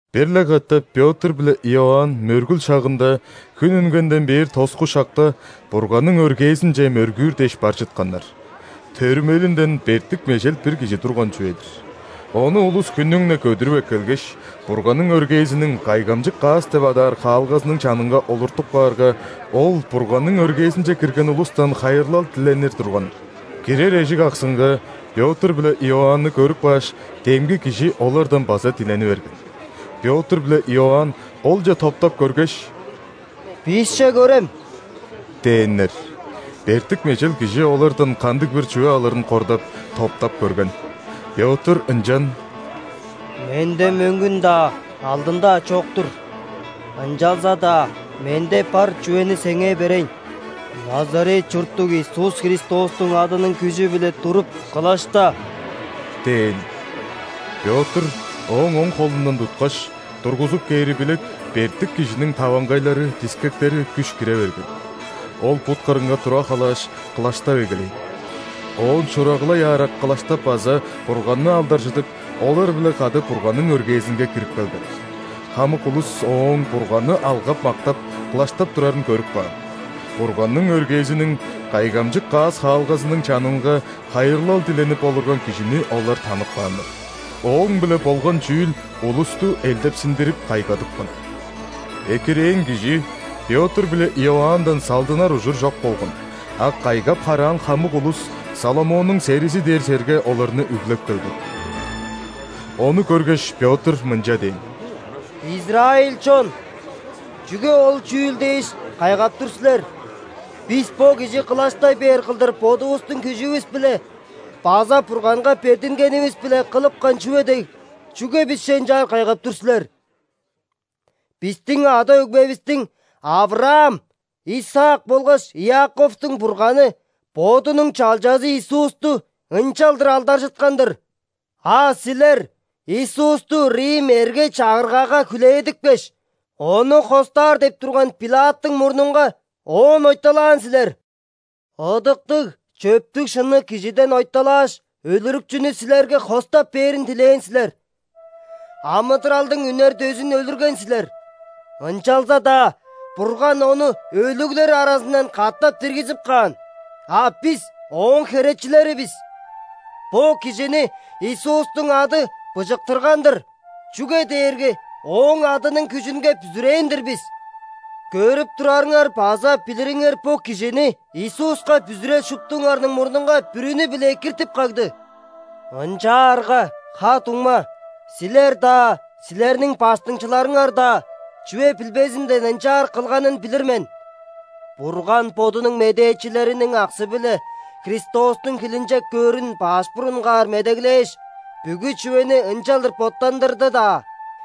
Бир-ле катап Пётр биле Иоанн мөргүл шагында (хүн үнгенден бээр тоску шакта) Бурганның өргээзинче мөргүүр дээш бар чытканнар. Төрүмелинден бертик-межел бир кижи турган чүве-дир. Ону улус хүннүң-не көдүрүп эккелгеш, Бурганның өргээзиниң Кайгамчык каас деп адаар хаалгазының чанынга олуртуп каарга, ол Бурганның өргээзинче кирген улустан хайырлал диленир турган. Кирер эжик аксынга Пётр биле Иоанны көрүп кааш, демги кижи олардан база дилени берген. Пётр биле Иоанн олче топтап көргеш: «Бисче көрем» – дээннер. Бертик-межел кижи олардан кандыг-бир чүве алырын кордап, топтап көрген. Пётр ынчан: «Менде мөңгүн-даа, алдын-даа чок-тур, ынчалза-даа менде бар чүвени сеңээ берейн: Назарет чурттуг Иисус Христостуң адының күжү-биле туруп, кылашта!» – дээн. Пётр ооң оң холундан туткаш, тургузуп кээри билек, бертик кижиниң таваңгайлары, дискектери күш кире берген. Ол бут кырынга тура халааш, кылаштап эгелээн. Оон шурагылай аарак кылаштап база Бурганны алдаржыдып, олар-биле кады Бурганның өргээзинге кирип келген. Хамык улус ооң Бурганны алгап-мактап, кылаштап турарын көрүп каан. Бурганның өргээзиниң Кайгамчык каас хаалгазының чанынга хайырлал диленип олурган кижини олар танып кааннар. Ооң-биле болган чүүл улусту элдепсиндирип, кайгадыпкан. Экирээн кижи Пётр биле Иоанндан салдынар ужур чок болган, а кайгап-хараан хамык улус Соломоннуң серизи дээр черге оларны үглеп келген. Ону көргеш, Пётр мынча дээн: «Израиль чон! Чүге ол чүүл дээш, кайгап тур силер? Бис бо кижи кылаштай бээр кылдыр бодувустуң күжүвүс-биле база Бурганга бердингенивис-биле кылыпкан чүве дег, чүге бисче ынчаар кайгап тур силер? Бистиң ада-өгбевистиң: Авраам, Исаак болгаш Иаковтуң Бурганы Бодунуң Чалчазы Иисусту ынчалдыр алдаржыткан-дыр. А силер Иисусту рим эрге-чагыргага хүлээдипкеш, Ону хостаар деп турган ·Пилаттың мурнунга Оон ойталаан силер. Ыдыктыг, чөптүг-шынныг Кижиден ойталааш, өлүрүкчүнү силерге хостап бээрин дилээн силер. Амыдыралдың Үнер дөзүн өлүрген силер! Ынчалза-даа Бурган Ону өлүглер аразындан катап диргизип каан, а бис ооң херечилери бис. Бо кижини Иисустуң ады быжыктырган-дыр, чүге дээрге Ооң адының күжүнге бүзүрээн-дир бис. Көрүп турарыңар база билириңер бо кижини Иисуска бүзүрел шуптуңарның мурнунга бүрүнү-биле экиртип кагды. Ынчаарга, ха-дуңма, силер-даа, силерниң баштыңчыларыңар-даа чүве билбезинден ынчаар кылганын билир мен. Бурган Бодунуң медээчилериниң аксы-биле Христостуң хилинчек көөрүн баш бурунгаар медеглээш, бүгү чүвени ынчалдыр боттандырды-даа.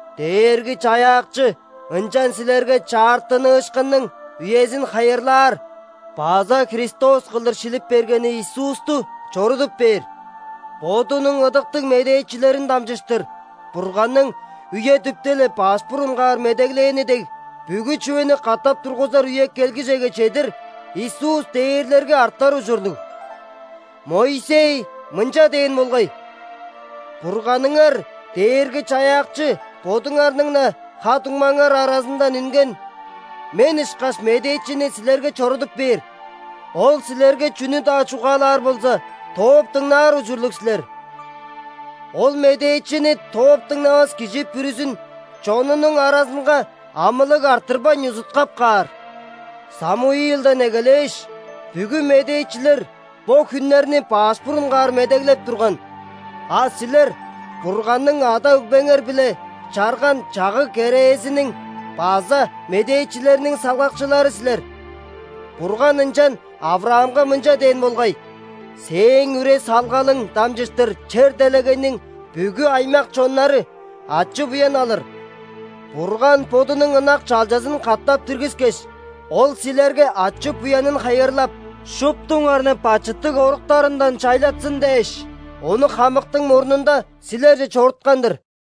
Дээрги-Чаяакчы ынчан силерге чаартыныышкынның үезин хайырлаар база Христос кылдыр шилип бергени Иисусту чорудуп бээр. Бодунуң ыдыктыг медээчилерин дамчыштыр Бурганның үе-дүпте-ле баш бурунгаар медеглээни дег, бүгү чүвени катап тургузар үе келгижеге чедир, Иисус дээрлерге артар ужурлуг. Моисей мынча дээн болгай: „Бурганыңар Дээрги-Чаяакчы бодуңарның-на ха-дуңмаңар аразындан үнген мен ышкаш Медээчини силерге чорудуп бээр. Ол силерге чүнү-даа чугаалаар болза, тооп дыңнаар ужурлуг силер. Ол Медээчини тооп дыңнавас кижи бүрүзүн чонунуң аразынга амылыг арттырбайн узуткап каар“. Самуилден эгелээш, бүгү медээчилер бо хүннерни баш бурунгаар медеглеп турган. А силер – Бурганның ада-өгбеңер-биле чарган чагыг-керээзиниң база медээчилерниң салгакчылары силер. Бурган ынчан ·Авраамга мынча дээн болгай: „Сээң үре-салгалың дамчыштыр чер-делегейниң бүгү аймак-чоннары ачы-буян алыр“. Бурган Бодунуң ынак Чалчазын катап диргискеш, Ол силерге ачы-буянын хайырлап, шуптуңарны бачыттыг оруктарындан чайлатсын дээш, Ону хамыктың мурнунда силерже чоруткан-дыр».